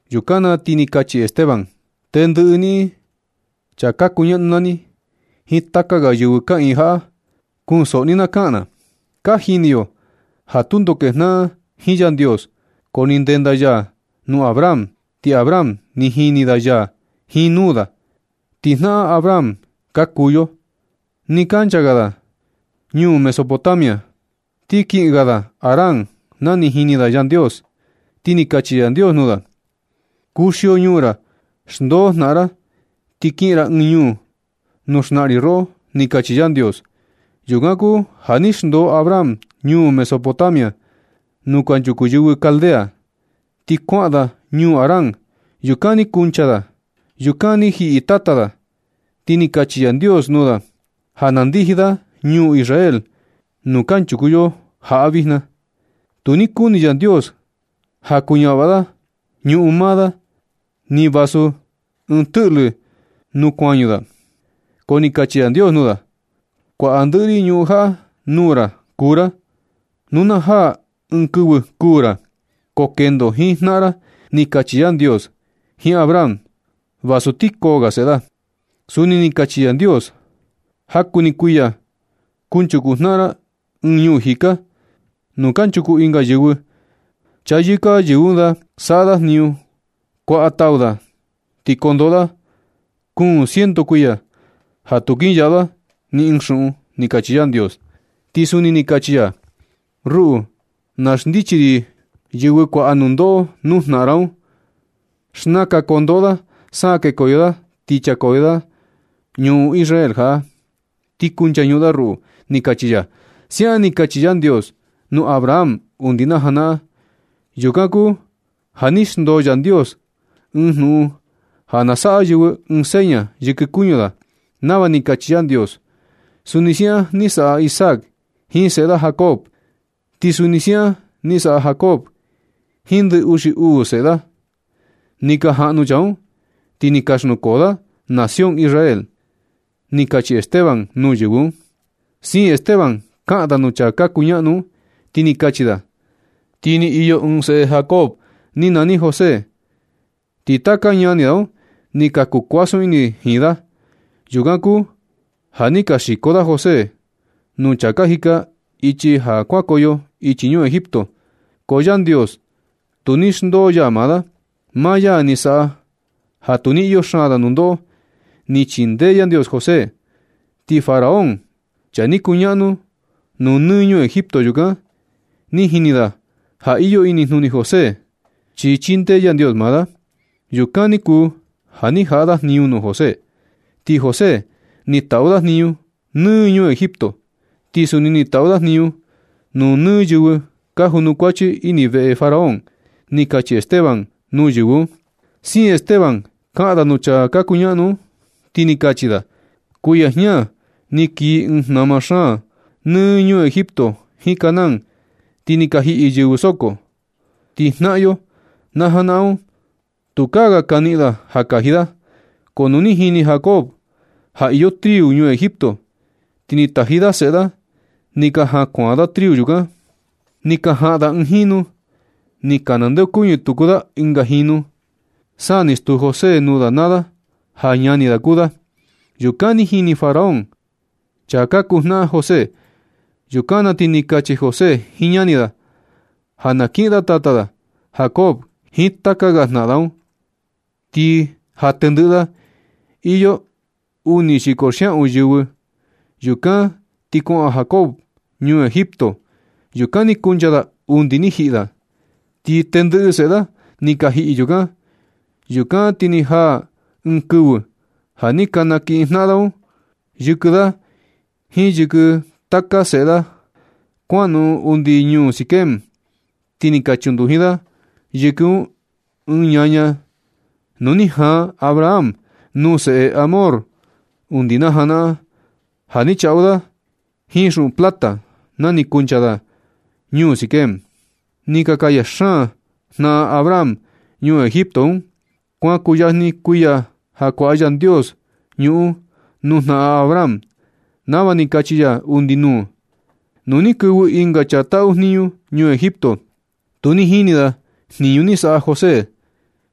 Yukan ti ni kachi Esteban: ―Tendɨꞌɨ niꞌin chaa ka kuñaꞌnu naa ni jiin taka ga yɨvɨ kaꞌiin jaꞌa, kunsoꞌo ni na kaꞌan na. Ka jini yo ja tundo kejnaꞌan jiin Yandios, ko ni ndenda ya nuu Abraham, ti Abraham ni jini da ya jiin nuu da. Ti jnaꞌan Abraham ka kuu yo. Nɨ kancha ga da ñuu Mesopotamia, ti kiꞌin ga da Harán na ni jini da Yandios. Ti ni kachi Yandios nuu da: “Kuxio ñuu ra, xndoo jnaꞌan ra, ti kiꞌin ra ɨɨn ñuu nuu xnaꞌan ri roꞌo”, ni kachi Yandios. Yukan kuu ja ni xndoo Abraham ñuu Mesopotamia nuu kanchuku yɨvɨ Caldea, ti kuaꞌan da ñuu Harán. Yukan ni kuncha da. Yukan ni jiꞌi tata da. Ti ni kachi Yandios nuu da ja na ndiji da ñuu Israel nuu kanchuku yo jaꞌa vijna. Tu ni kuni Yandios ja kuñavaꞌa da ñuꞌun maa da, ni vasu ɨɨn tɨꞌlɨ nuu kuañu da, ko ni kachi Yandios nuu da: “Kuaꞌa ndɨꞌɨ ri ñuꞌun jaꞌa nuu ra kuu ra. Nu na jaa ɨɨn kɨvɨ kuū ra, ko kendo jiin jnaꞌan ra”, ni kachi Yandios jiin Abraham, vasu ti koo ga seꞌe da. Suni ni kachi Yandios: “Jaku ni kuiya kunchuku jnaꞌan ra ɨɨn ñuu jika, nuu kanchuku ɨnga yɨvɨ. Chayɨka yɨvɨ un da saꞌa da jniñu, kuaꞌa tau da, ti kondoꞌo da kuun ciento kuiya ja tu kinyaꞌu da ni ɨɨn xuꞌun”, ni kachi Yandios. Ti suni ni kachi ya: “Ruꞌu na xndichi ri yɨvɨ kuaꞌa nundoꞌo nuu jnaꞌan ra un. Xnaka kondoꞌo da sa kekoyo da, ti nchakoyo da ñuꞌun Israel jaꞌa, ti kunchañuꞌun da ruꞌu”, ni kachi ya. Siaꞌan ni kachi Yandios nuu Abraham undi na janaꞌan. Yukan kuu ja ni xndoo Yandios ɨɨn jnuꞌun ja na saꞌa yɨvɨ ɨɨn seña yɨkɨ kuñu da nava ni kachi Yandios. Suni siaꞌan ni saꞌa Isaac jiin seꞌe da Jacob, ti suni siaꞌan ni saꞌa Jacob jiin ndɨ uxi uu seꞌe da. Ni ka jaꞌnu chaa un, ti ni ka xnukoo da nación Israel ―ni kachi Esteban nuu yɨvɨ un. Siin Esteban kaꞌan da nuu chaa ka kuñaꞌnu un, ti ni kachi da: ―Ti ni iyo ɨɨn seꞌe Jacob ni nani José, ti taka ñani da un ni ka kuu kuasun ini jiin da. Yukan kuu ja ni ka xiko da José nuu chaa ka jika ichi ja kuankoyo ichi ñuu Egipto, ko Yandios tu ni xndoo ya maa da. Maa ya ni saꞌa ja tu ni iyo xaan da nundoꞌo. Ni chindee Yandios José, ti Faraón, chaa ni kuñaꞌnu nuu nɨ ñuu Egipto yukan, ni jini da ja iyo inijnuni José, chi chindee Yandios maa da. Yukan ni kuu ja ni jaꞌa da jniñu nuu José, ti José ni taꞌu da jniñu nɨ ñuu Egipto, ti suni ni taꞌu da jniñu nuu yɨvɨ ni ka junukuachi ini veꞌe Faraón ―ni kachi Esteban nuu yɨvɨ un. Siin Esteban kaꞌan da nuu chaa ka kuñaꞌnu un, ti ni kachi da: ―Kuiya jña ni kii ɨɨn jnama xaan nɨ ñuu Egipto jiin Canaán, ti ni ka jiꞌi yɨvɨ soko. Ti jnaꞌan yo na janaꞌan un, tukaa ga ni ka niꞌin da ja kaji da. Ko nu ni jini Jacob ja iyo triu ñuu Egipto, ti ni taji da seꞌe da ni ka jan kuan da triu yukan. Ni ka jaꞌan da ɨɨn jinu. Ni ka nandeokuñɨ tuku da ɨnga jinu, sa ni stuu José nuu da naa da ja ñani da kuu da. Yukan ti ni jini Faraón chaa ka kuu jnaꞌan José. Yukan na ti ni kachi José jiin ñani da ja na kiꞌin tata da Jacob jiin taka ga jnaꞌan da un. Ti ja tɨndɨꞌɨ da, iyo uni xiko xiaꞌun yɨvɨ. Yukan ti kuaꞌan Jacob ñuu Egipto. Yukan ni kuncha da undi ni jiꞌi da. Ti tɨndɨꞌɨ seꞌe da ni ka jiꞌi yukan. Yukan ti ni jaa ɨɨn kɨvɨ ja ni ka nakiꞌin jnaꞌan da un yɨkɨ da jiin yɨkɨ taka seꞌe da kuanoꞌon undi ñuu Siquem, ti ni ka chunduji da yɨkɨ un ɨɨn ñaña nuu ni jaan Abraham nuu seꞌe Hamor undi najanaꞌan. Ja ni chaꞌu da jiin xuꞌun plata na ni kuncha da ñuu Siquem. Ni ka kaya xaan jnaꞌan Abraham ñuu Egipto un. Kuan kuyajni kuiya ja kuaꞌa Yandios ñuꞌun nuu jnaꞌan Abraham nava ni kachi ya undi nuu. Nu ni kɨvɨ ɨnga chaa taꞌu jniñu ñuu Egipto, tu ni jini da jniñu ni saꞌa José,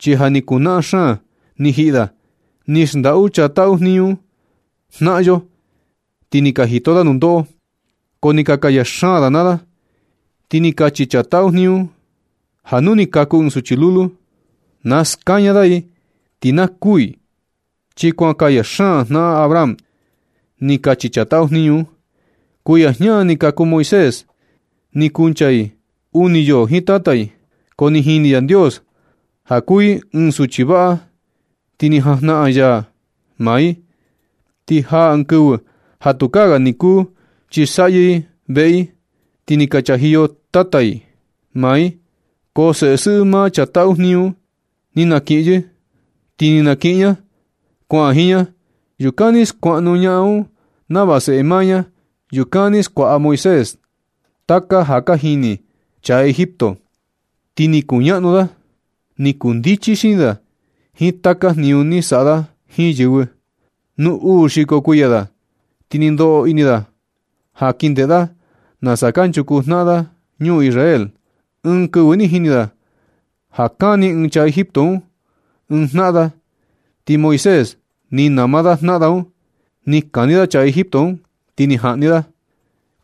chi ja ni kuu naꞌan xaan ni jiꞌi da. Ni xndaꞌu chaa taꞌu jniñu un jnaꞌan yo, ti ni ka jito da nundoꞌo. Ko ni ka kaya xaan da naa da. Ti ni kachi chaa taꞌu jniñu un ja nu ni kaku ɨɨn suchi lulu, na skaña da i ti na kuū i, chi kuan kaya xaan jnaꞌan Abraham, ni kachi chaa taꞌu jniñu un. Kuiya jña ni kaku Moisés. Ni kuncha i uni yoo jiin tata i, ko ni jini Yandios ja kuu i ɨɨn suchi vaꞌa, ti ni jajnaꞌan ini ya maa i. Ni jaa ɨɨn kɨvɨ ja tukaa ga ni kuu kɨsaꞌyɨ i veꞌe i, ti ni ka chajiyo tata i maa i. Ko seꞌe sɨꞌɨ maa chaa taꞌu jniñu un ni naniꞌin yɨ, ti ni na kiꞌin ña kuaꞌan jiin ña. Yukan ni skuaꞌnu ñaꞌan un nava seꞌe maa ña. Yukan ni skuaꞌa Moisés taka ja ka jini chaa Egipto, ti ni kuñaꞌnu da. Ni kuu ndichi xini da jiin taka jniñu ni saꞌa da jiin yɨvɨ. Nu uu xiko kuiya da, ti ni ndoꞌo ini da ja kin ndeꞌe da nasa kanchuku jnaꞌan da ñuu Israel. Ɨɨn kɨvɨ ni jini da ja kani ɨɨn chaa Egipto un ɨɨn jnaꞌan da, ti Moisés ni nama da jnaꞌan da un, ni kani da chaa Egipto un, ti ni jaꞌni da.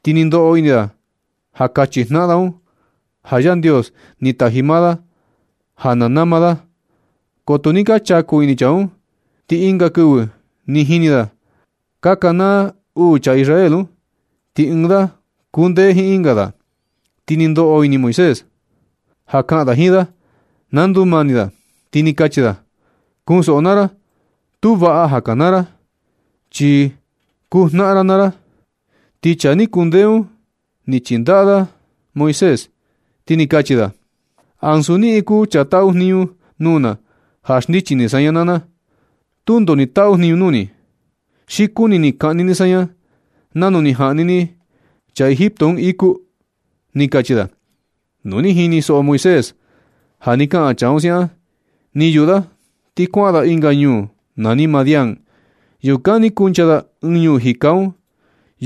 Ni ndoꞌo ini da ja kachi jnaꞌan da un ja Yandios ni taji maa da ja na nama da, ko tu ni ka chaku ini chaa un. Ti ɨnga kɨvɨ ni jini da ka kanaa uu chaa Israel un, ti ɨɨn da kundee jiin ɨnga da. Ti ni ndoꞌo ini Moisés ja kaꞌan da jiin da na ndumani da, ti ni kachi da: “Kunsoꞌo naa ra, tu vaꞌa ja ka kanaa ra, chi kuu jnaꞌan ra naa ra.” Ti chaa ni kundee un ni chindaꞌa da Moisés, ti ni kachi da: “Ansu niꞌin kuu chaa taꞌu jniñu nuu na ja xndichi ni saña naa na. Tundo ni taꞌu jniñu nuu ni. Xi kuni ni kaꞌni ni saña nanu ni jaꞌni ni chaa Egipto un iku”, ni kachi da. Nu ni jinisoꞌo Moisés ja ni kaꞌan chaa un siaꞌan, ni yuꞌu da ti kuaꞌan da ɨnga ñuu nani Madián. Yukan ni kuncha da ɨɨn ñuu jika un.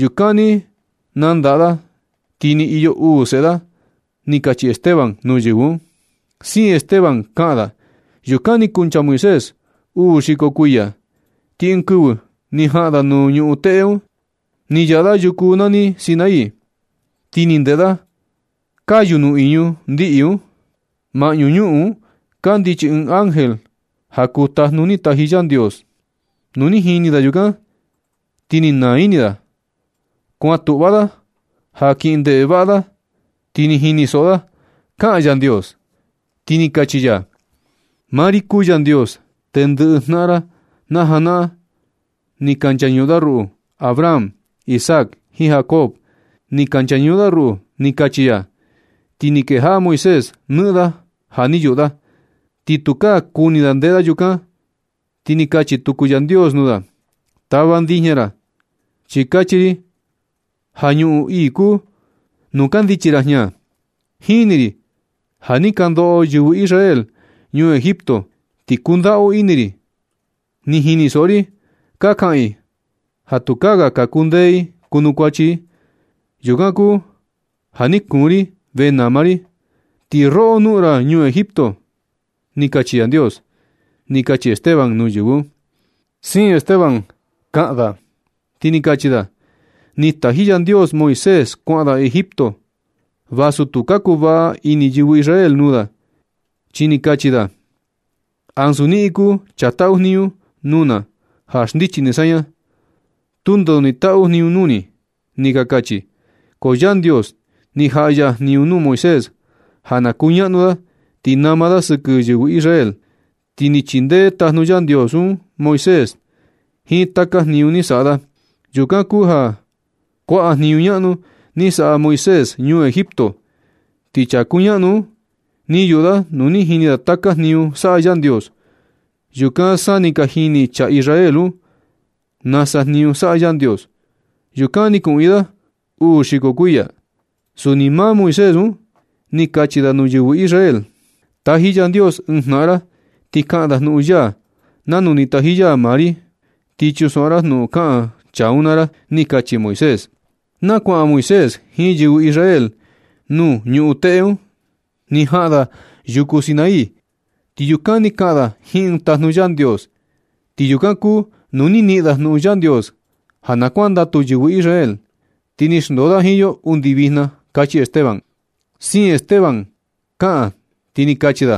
Yukan ni nandaꞌa da, ti ni iyo uu seꞌe da ―ni kachi Esteban nuu yɨvɨ un. Siin Esteban kaꞌan da: ―Yukan ni kuncha Moisés uu xiko kuiya, ti ɨɨn kɨvɨ ni jaꞌan da nuu ñuꞌun teꞌe un. Ni yaꞌa da yuku nani Sinaí, ti ni ndeꞌe da kayu nuꞌiñu ndiꞌi un. Maꞌñu ñuꞌun un kandichi ɨɨn ángel ja kuu tajnu ni taji Yandios. Nu ni jini da yukan ti ni naa ini da. Kuan tuꞌva da ja kin ndeꞌe vaꞌa da. Ti ni jinisoꞌo da kaꞌan Yandios. Ti ni kachi ya: “Maa ri kuu Yandios. Tendɨꞌɨ jnaꞌan ra najanaꞌan ni ka nchañuꞌun da ruꞌu. Abraham, Isaac jiin Jacob ni ka nchañuꞌun da ruꞌu”, ni kachi ya. Ti ni kejaꞌa Moisés nɨꞌɨn da ja ni yuꞌu da, ti tukaa kuni da ndeꞌe da yukan. Ti ni kachi tuku Yandios nuu da: “Tava ndijña ra, chi kachi ri ja ñuꞌun ii kuu nuu kandichi ra jña. Jini ri ja ni ka ndoꞌo yɨvɨ Israel ñuu Egipto, ti kundaꞌu ini ri. Ni jinisoꞌo ri ka kaꞌan i ja tukaa ga ka kundee i kuchaku i. Yukan kuu ja ni kuun ri venama ri i. Ti roꞌo, noꞌon ra ñuu Egipto”, ni kachi Yandios ―ni kachi Esteban nuu yɨvɨ un. Siin Esteban kaꞌan da, ti ni kachi da: ―Ni taji Yandios Moisés kuaꞌan da Egipto, vasu tu ka kuvaꞌa ini yɨvɨ Israel nuu da, chi ni kachi da: “Ansu niꞌin kuu chaa taꞌu jniñu nuu na ja xndichi ni saña. Tundo ni taꞌu jniñu nuu ni”, ni ka kachi. Ko Yandios ni jaꞌa ya jniñu nuu Moisés ja na kuñaꞌnu da, ti nama da sɨkɨ yɨvɨ Israel, ti ni chindee tajnu Yandios un Moisés jiin taka jniñu ni saꞌa da. Yukan kuu ja kuaꞌa jniñu ñaꞌnu ni saꞌa Moisés ñuu Egipto, ti chaa kuñaꞌnu un ni yuꞌu da nu ni jini da taka jniñu saꞌa Yandios. Yukan sa ni ka jini chaa Israel un nasa jniñu saꞌa Yandios. Yukan ni kuꞌiin da uu xiko kuiya. Suni maa Moisés un ni kachi da nuu yɨvɨ Israel: “Taji Yandios ɨɨn jnaꞌan ra ti kaꞌan da jnuꞌun ya nanu ni taji ya maa ri. Ti chunsoꞌo ra jnuꞌun kaꞌan chaa un naa ra”, ni kachi Moisés. Na kuaꞌan Moisés jiin yɨvɨ Israel nuu ñuꞌun teꞌe un. Ni jaꞌan da yuku Sinaí, ti yukan ni kaꞌan da jiin ɨɨn tajnu Yandios. Ti yukan kuu nuu ni niꞌin da jnuꞌun Yandios ja na kuandatu yɨvɨ Israel, ti ni xndoo da jiin yo undi vijna ―kachi Esteban. Siin Esteban kaꞌan, ti ni kachi da: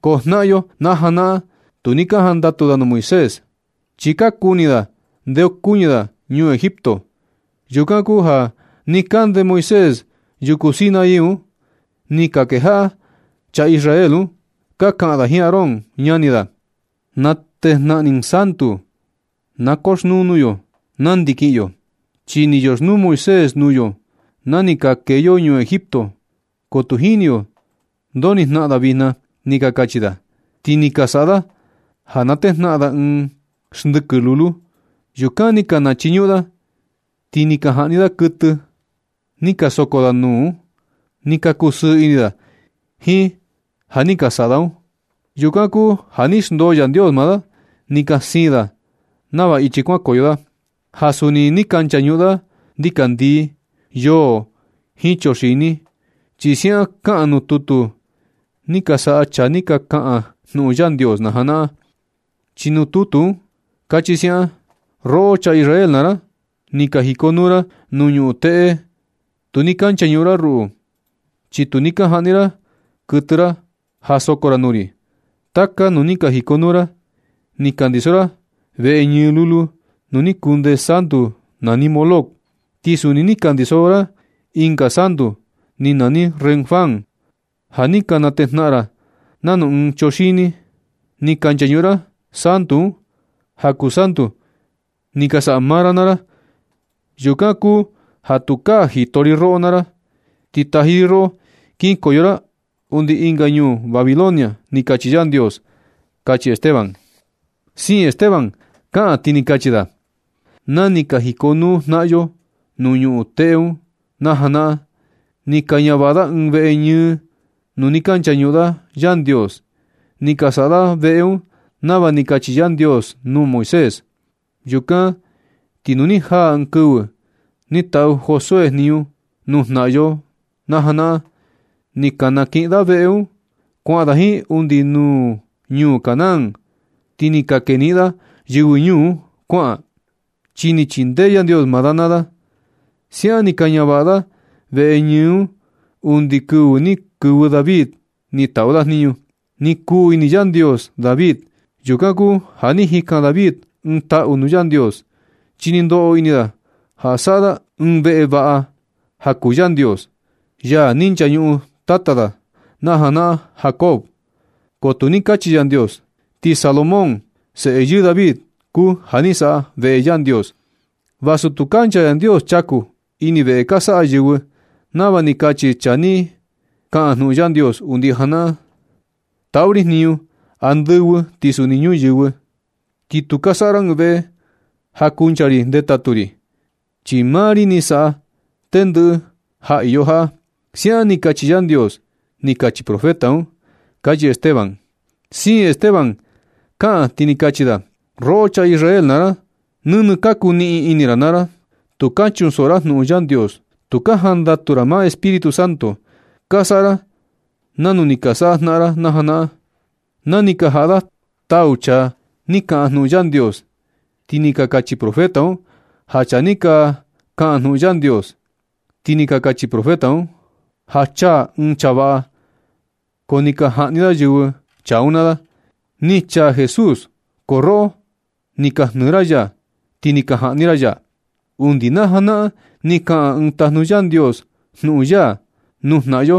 ―Ko jnaꞌan yo na janaꞌan, tu ni ka jandatu da nuu Moisés, chi ka kuni da ndeokuñɨ da ñuu Egipto. Yukan kuu ja nɨ kande Moisés yuku Sinaí un, ni ka kejaꞌa chaa Israel un ka kaꞌan da jiin Aarón, ñani da: “Natejnaꞌan ɨɨn santu na koxnuu nuu yo nandi kiꞌin yo, chi ni yoxnuu Moisés nuu yo na ni ka kee yo ñuu Egipto, ko tu jini yo ndo ni jnaꞌan da vijna”, ni ka kachi da. Ti ni ka saꞌa da ja natejnaꞌan da ɨɨn xndɨkɨ lulu. Yukan ni ka nachiñuꞌun da, ti ni ka jaꞌni da kuɨtɨ da ni ka soko da nuu un. Ni ka kusɨɨ ini da jiin ja ni ka saꞌa da un. Yukan kuu ja ni xndoo Yandios maa da, ni ka siin da nava ichi kuankoyo da, ja suni ni ka nchañuꞌun da ndikandii, yoo jiin chuxini. Chi siaꞌan kaꞌan nuu tutu ni ka saꞌa chaa ni ka kaꞌan jnuꞌun Yandios na janaꞌan, chi nuu tutu un kachi siaꞌan: “Roꞌo chaa Israel naa ra, ni ka jikonuu ra nuu ñuꞌun teꞌe, tu ni ka nchañuꞌun ra ruꞌu, chi tu ni ka jaꞌni ra kuɨtɨ ra ja soko ra nuu ri. Taka nuu ni ka jikonuu ra ni ka ndiso ra veꞌe ñɨ lulu nuu ni kunde santu nani Moloc. Ti suni ni ka ndiso ra ɨnga santu ni nani Renfán ja ni ka natejnaꞌan ra nanu ɨɨn chuxini. Ni ka nchañuꞌun ra santu un ja kuu santu ni ka saꞌa maa ra naa ra. Yukan kuu ja tukaa jito ri roꞌo naa ra. Ti taji ri roꞌo kinkoyo ra undi ɨnga ñuu Babilonia”, ni kachi Yandios ―kachi Esteban. Siin Esteban kaꞌan, ti ni kachi da: ―Na ni ka jikonuu jnaꞌan yo nuu ñuꞌun teꞌe un na najanaꞌan, ni ka ñavaꞌa da ɨɨn veꞌe ñɨ nuu ni ka nchañuꞌun da Yandios. Ni ka saꞌa da veꞌe un nava ni kachi Yandios nuu Moisés. Yukan ti nu ni jaa ɨɨn kɨvɨ ni taꞌu Josué jniñu nuu jnaꞌan yo najanaꞌan, ni ka kaniꞌin da veꞌe un kuaꞌan da jiin undi nuu ñuu Canaán. Ti ni ka keniꞌin da yɨvɨ ñuu un kuaꞌan, chi ni chindee Yandios maa da naa da. Siaꞌan ni ka ñavaꞌa da veꞌe ñɨ un undi kɨvɨ ni kɨvɨ David ni taꞌu da jniñu. Ni kuu ini Yandios David. Yukan kuu ja ni jikan David ɨɨn taꞌu nuu Yandios, chi ni ndoꞌo ini da ja saꞌa da ɨɨn veꞌe vaꞌa ja kuu Yandios, ya ni nchañuꞌun tata da najanaꞌan Jacob, ko tu ni kachi Yandios. Ti Salomón, seꞌe yɨɨ David kuu ja ni saꞌa veꞌe Yandios. Vasu tu kancha Yandios chaku ini veꞌe ka saꞌa yɨvɨ, nava ni kachi chaa ni kaꞌan jnuꞌun Yandios undi janaꞌan: Taꞌu ri jniñu andɨvɨ ti suni nuu ñuyɨvɨ, Ti tu ka saꞌa ra ɨɨn veꞌe ja kuncha ri ndetatu ri. Chi maa ri ni saꞌa tendɨꞌɨ ja iyo jaꞌa. Siaꞌan ni kachi Yandios, ni kachi profeta un ―kachi Esteban. Siin Esteban kaꞌan, ti ni kachi da: ―Roꞌo chaa Israel naa ra, nɨnɨ ka kuniꞌin ini ra naa ra. Tu ka chunsoꞌo ra jnuꞌun Yandios. Tu ka jandatu ra nuu Espíritu Santo. Ka saꞌa ra nanu ni ka saꞌa jnaꞌan ra najanaꞌan, na ni ka jaꞌa da tau chaa ni ka kaꞌan jnuꞌun Yandios. Ti ni ka kachi profeta un ja chaa ni ka kaꞌan jnuꞌun Yandios. Ti ni ka kachi profeta un ja chaa ɨɨn chaa vaꞌa, ko ni ka jaꞌni yɨvɨ chaa un naa da. Ni chaa Jesús, ko roꞌo ni ka jnɨɨ ra ya, ti ni ka jaꞌni ra ya. Undi najanaꞌan ni kaꞌan ɨɨn tajnu Yandios jnuꞌun ya nuu jnaꞌan yo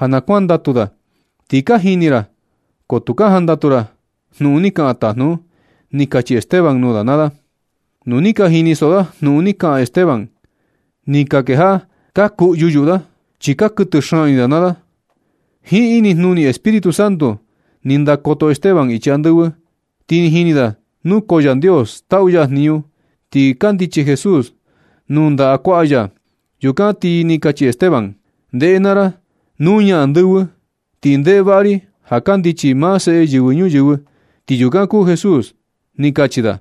ja na kuandatu da, ti ja ka jini ra, ko tu ka jandatu ra jnuꞌun ni kaꞌan tajnu un ―ni kachi Esteban nuu da naa da. Nu ni ka jinisoꞌo da jnuꞌun ni kaꞌan Esteban, ni ka kejaꞌa ka kuꞌyu yuꞌu da, chi ni ka kuɨtɨ xaan ini da naa da. Jiin inijnuni Espíritu Santo ni ndakoto Esteban ichi andɨvɨ, ti ni jini da nukoo Yandios taꞌu ya jniñu, ti kandichi Jesús nuu ndaꞌa kuaꞌa ya. Yukan ti ni kachi Esteban: ―Ndeꞌe naa ra, nuña andɨvɨ, ti ndeꞌe vaꞌa ri ja kandichi maa Seꞌe Yɨvɨ Ñuyɨvɨ, ti yukan kuu Jesús ―ni kachi da.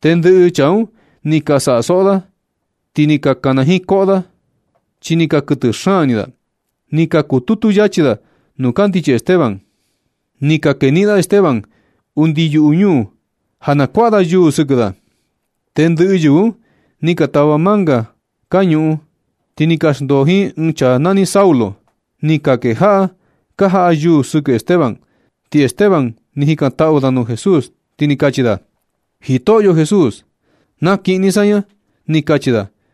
Tendɨꞌɨ chaa un ni ka saꞌa soꞌo da, ti ni ka kana jiin koꞌo da, chi ni ka kuɨtɨ xaan ini da. Ni ka kututu yachi da nuu kandichi Esteban. Ni ka keniꞌin da Esteban undi yuꞌu ñuu ja na kuaꞌa da yuu sɨkɨ da. Tendɨꞌɨ yɨvɨ un ni ka tava manga ka ñuꞌun, ti ni ka xndoo jiin ɨɨn chaa nani Saulo. Ni ka kejaꞌa ka jaꞌa da yuu sɨkɨ Esteban, ti Esteban ni jikantaꞌu da nuu Jesús ti ni kachi da: ―Jitoꞌyo Jesús, nakiꞌin ni saña ―ni kachi da.